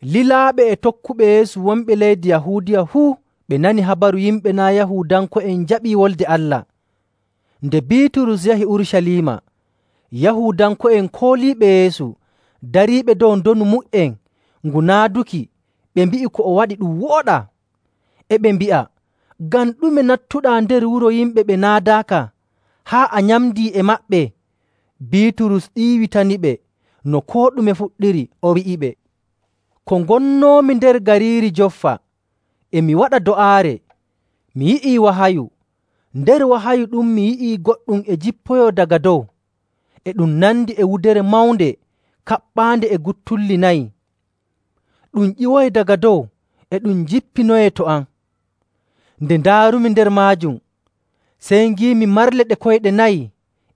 Lilaaɓe e tokkuɓe Yeesu wonɓe leydi Yahuudiya fuu ɓe nanii habaru yimɓe naa' Yahuudanko'en njaɓii Wolde Allah. Nde Biiturus yahi Urucaliima, Yahuudanko'en kooliiɓe Yeesu dariiɓe dow ndonu mu''en ngu naaduki ɓe mbi'i ko o waɗi ɗum wooɗaa, e ɓe mbi'a, “Ngam ɗume nattuɗaa nder wuro yimɓe ɓe naadaaka, haa a nyamdii e maɓɓe?” Biiturus ɗiiwitaniɓe no koo ɗume fuɗɗiri, o wi'iɓe, “Ko ngonnoomi nder gariiri Joffa e mi waɗa do'aare, mi yi'ii wahayu. Nder wahayu ɗum mi yi'ii goɗɗum e jippoyoo daga dow. E ɗum nandi e wudere mawnde kaɓɓaande e guttulli nayi. Ɗum ƴiwoyi daga dow e ɗum jippinoyee to am. Nde ndaarumi nder maajum, sey ngiimi marle ɗe koyɗe nayi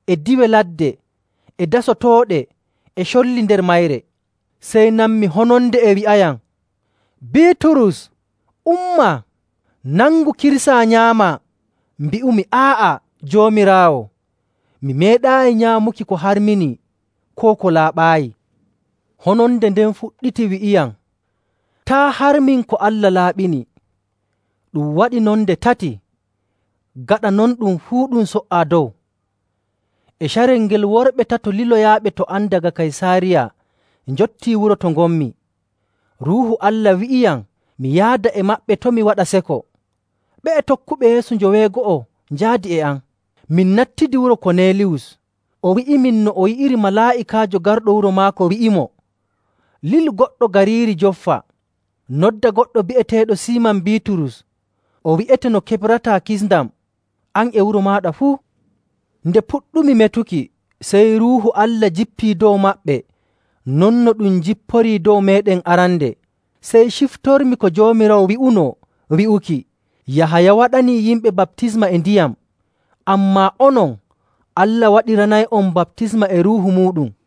e diiwe ladde e dasotooɗe e colli nder mayre. Sey nanmi hononde e wi'ayam, ‘Biiturus, umma, nangu, kirsaa, nyaamaa!’ Mbi'umi, ‘Aa'a, Joomiraawo! Mi meeɗaayi nyaamuki ko harminii koo ko laaɓaayi.’ Hononde nden fuɗɗiti wi'iyam, ‘Taa' harmin ko Allah laaɓini.’ Ɗum waɗi non nde tati. Gaɗa non ɗum fuu ɗum so''aa dow. E carel ngel, worɓe tato liloyaaɓe to am daga Kaysaariya njottii wuro to ngonmi. Ruuhu Allah wi'iyam mi yaada e maɓɓe to' mi waɗa seko. Ɓe'e tokkuɓe Yeesu joweego'o njaadi e am, min nattidi wuro Koneeliyus. O wi'imin no o yi'iri malaa'ikaajo garɗo wuro maako wi'imo, ‘Lilu goɗɗo gariiri Joffa, noddaa goɗɗo bi'eteeɗo Siiman Biiturus. O wi'ete no keɓrataa kisndam, an e wuro maaɗa fuu.’ Nde puɗɗumi metuki, sey Ruuhu Allah jippii dow maɓɓe non no ɗum jipporii dow meeɗen arande. Sey ciftormi ko Joomiraawo wi'unoo wi'uki, ‘Yahaya waɗanii yimɓe baptisma e ndiyam, ammaa onon, Allah waɗiranay'on baptisma e Ruuhu muuɗum.’.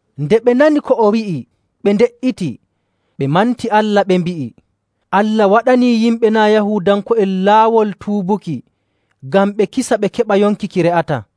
Nde ɓe nani ko o wi'i, ɓe nde''iti, ɓe manti Allah, ɓe mbi'i, “Allah waɗanii yimɓe naa' Yahuudanko'en laawol tuubuki ngam ɓe kisa ɓe keɓa yonki ki re'ataa.”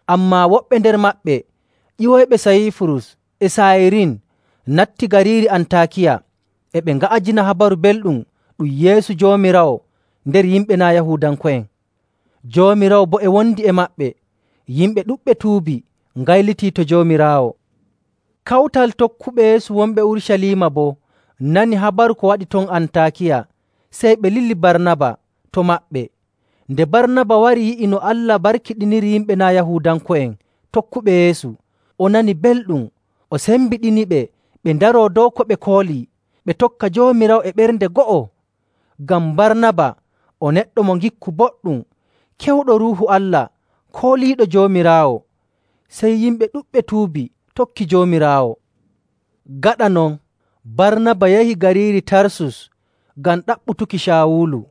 Ammaa woɓɓe nder maɓɓe ƴiwoyɓe Sayiifurus e Saayirin natti gariiri Antaakiya, e ɓe nga'ajina Habaru Belɗum ɗum Yeesu Joomiraawo nder yimɓe naa' Yahuudanko'en. Joomiraawo boo e wondi e maɓɓe; yimɓe ɗuɗɓe tuubi ngaylitii to Joomiraawo. Kawtal tokkuɓe Yeesu wonɓe Urucaliima boo nanii habaru ko waɗi ton Antaakiya, sey ɓe lili Barnaba to maɓɓe. Nde Barnaba wari yi'i no Allah barkiɗiniri yimɓe naa' Yahuudanko'en tokkuɓe Yeesu, o nani belɗum, o sembiɗiniɓe ɓe ndaroo dow ko ɓe koolii, ɓe tokka Joomiraawo e ɓernde go'o. Ngam Barnaba o neɗɗo mo ngikku boɗɗum, kewɗo Ruuhu Allah kooliiɗo Joomiraawo. Sey yimɓe ɗuɗɓe tuubi tokki Joomiraawo. Gaɗa non, Barnaba yahi gariiri Tarsus ngam ɗaɓɓutuki Caawulu.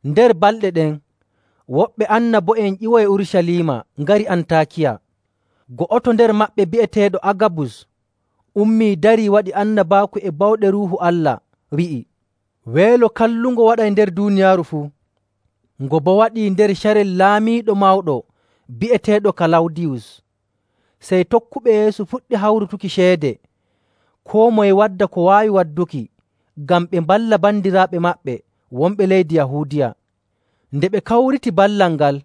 Nder balɗe ɗen, woɓɓe annabo'en ƴiwoyi Urucaliima ngari Antaakiya. Go'oto nder maɓɓe bi'eteeɗo Agabus ummii darii waɗi annabaaku e bawɗe Ruuhu Allah, wi'i weelo kallungo waɗay nder duuniyaaru fuu. Ngo boo waɗi nder carel laamiiɗo mawɗo bi'eteeɗo Kalawdiyus.. Sey tokkuɓe Yeesu puɗɗi hawrutuki ceede, koo moye wadda ko waawi wadduki, ngam ɓe mballa bandiraaɓe maɓɓe wonɓe leydi Yahuudiya. Nde ɓe kawriti ballal ngal,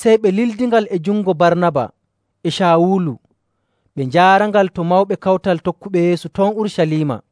sey ɓe lildingal e jungo Barnaba e Caawulu, ɓe njaarangal to mawɓe kawtal tokkuɓe Yeesu ton Urucaliima.